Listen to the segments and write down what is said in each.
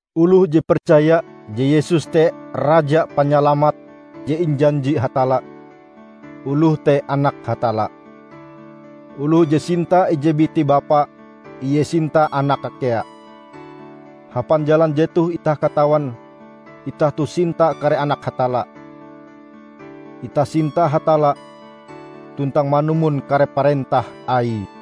Oloh je percaya je Yesus te Raja Panyalamat je injanji Hatalla, oloh te anak Hatalla. Oloh je sinta ije biti bapa, ie sinta anake kea. Hapan jalan jetoh itah katawan itah toh sinta kare anak Hatalla: Itah sinta Hatalla tuntang manumon kare parentah Aie.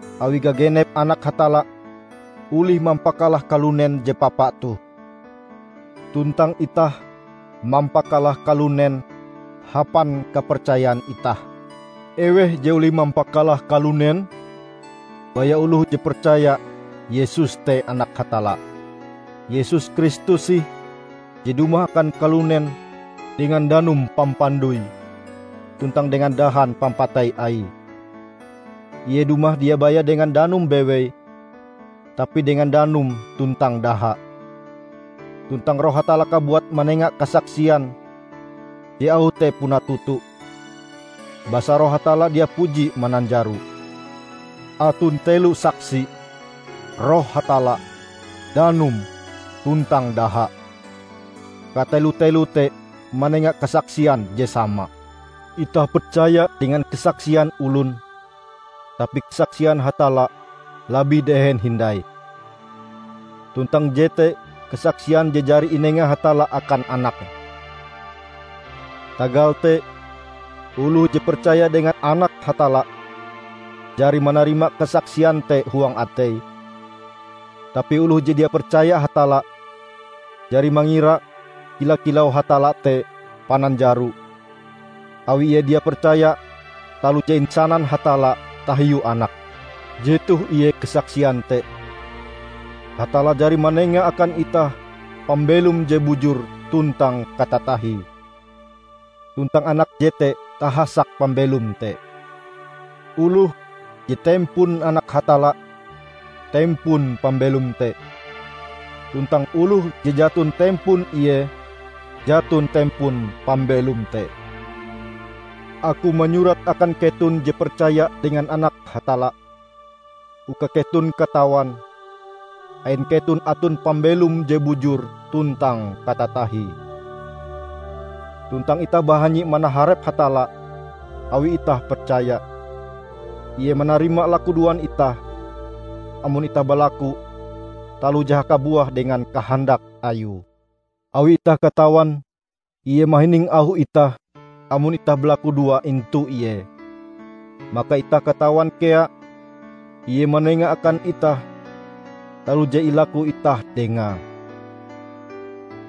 awi gagenep anak Hatalla olih mampakalah kalunen je papa toh. Tuntang itah mampakalah kalunen hapan kapercayan itah. Eweh je olih mampakalah kalunen? Baya oloh je percaya Yesus te Anak Hatalla. Yesus Kristus ih je dumah akan kalunen dengan danum pampandoi tuntang dengan dahan pampatei Aie. Ie dumah dia baya dengan danum bewei, tapi dengan danum tuntang daha. Tuntang Roh Hatalla kabuat manenga kasaksian je auh te puna toto, basa Roh Hatalla dia puji mananjaro. Aton telo saksi: Roh Hatalla, danum tuntang daha -- katelo-teloe te manenga kasaksian je sama. Itah percaya dengan kasaksian olon, tapi kasaksian Hatalla labih dehen hindai. Tuntang jete kasaksian je jari inenga Hatalla akan Anake. Tagal te, oloh je percaya dengan Anak Hatalla, jari manarima kasaksian te huang ateie; tapi oloh je dia percaya Hatalla, jari mangira kila-kilau Hatalla te pananjaro, awi ie dia percaya taloh je insanan Hatalla tahiu Anake. Jetoh ie kasaksian te: Hatalla jari manenga akan itah pambelom je bujur tuntang katatahie, tuntang Anake jete tahasak pambelom te. Oloh je tempon Anak Hatalla, tempon pambelom te; tuntang oloh je jaton tempon Ie, jaton tempon pambelom te. Aku manyurat akan keton je percaya dengan Anak Hatalla, uka keton katawan, ain keton aton pambelom je bujur tuntang katatahie. Tuntang itah bahanyi manaharep Hatalla, awi itah percaya, Ie manarima lakudoan itah, amon itah balaku taloh je hakabuah dengan kahandak Ayue. Awi itah katawan Ie mahining auh itah amon itah balakudoa intu Ie, maka itah katawan kea Ie manenga akan itah taloh je ilaku itah Dengae.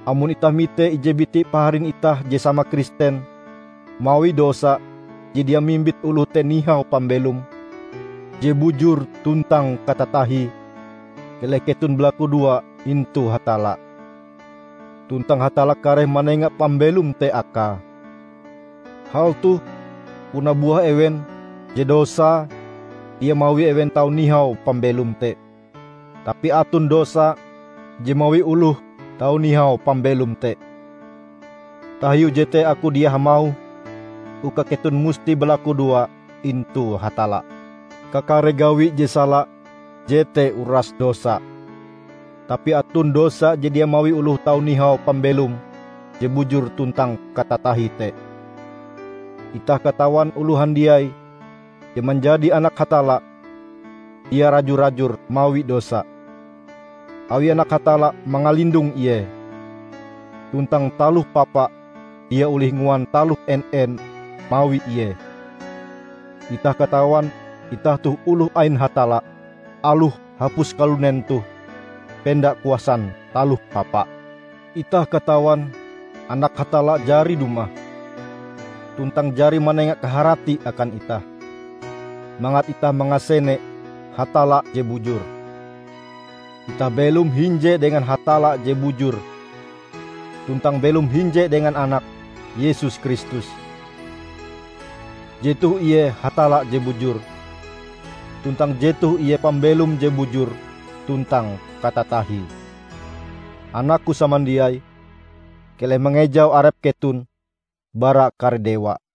Amon itah mite ije biti paharin itah je sama Kristen mawi dosa je dia mimbit oloh te nihau pambelom je bujur tuntang katatahie, keleh keton balakudoa intu Hatalla; tuntang Hatalla kareh manenga pambelom te akae. Hal toh puna buah ewen je dosae dia mawi ewen tau nihau pambelom te. Tapi aton dosa je mawi oloh tau nihau pambelom te. Tahiu jete aku dia hamauh uka keton musti balakudoa intu Hatalla. Kakare gawi je sala jete uras dosa, tapi aton dosa je dia mawi oloh tau nihau pambelom je bujur tuntang katatahie te. Itah katawan oloh handiai je manjadi Anak Hatalla, dia raju-rajur mawi dosa, awi Anak Hatalla mangalindong ie, tuntang Taloh Papa dia olih nguan taloh en-en mawi ie. Itah katawan itah toh oloh ain Hatalla, aloh hapus kalunen toh penda kuasan Taloh Papa. Itah katawan Anak Hatalla jari dumah tuntang jari manenga kaharati akan itah, mangat itah mangasene Hatalla je bujur. Itah belom hinje dengan Hatalla je bujur tuntang belom hinje dengan Anake Yesus Kristus. Jetoh ie Hatalla je bujur, tuntang jetoh ie pambelom je bujur tuntang katatahie. Anakku samandiai, keleh mangejau arep keton bara kare dewa!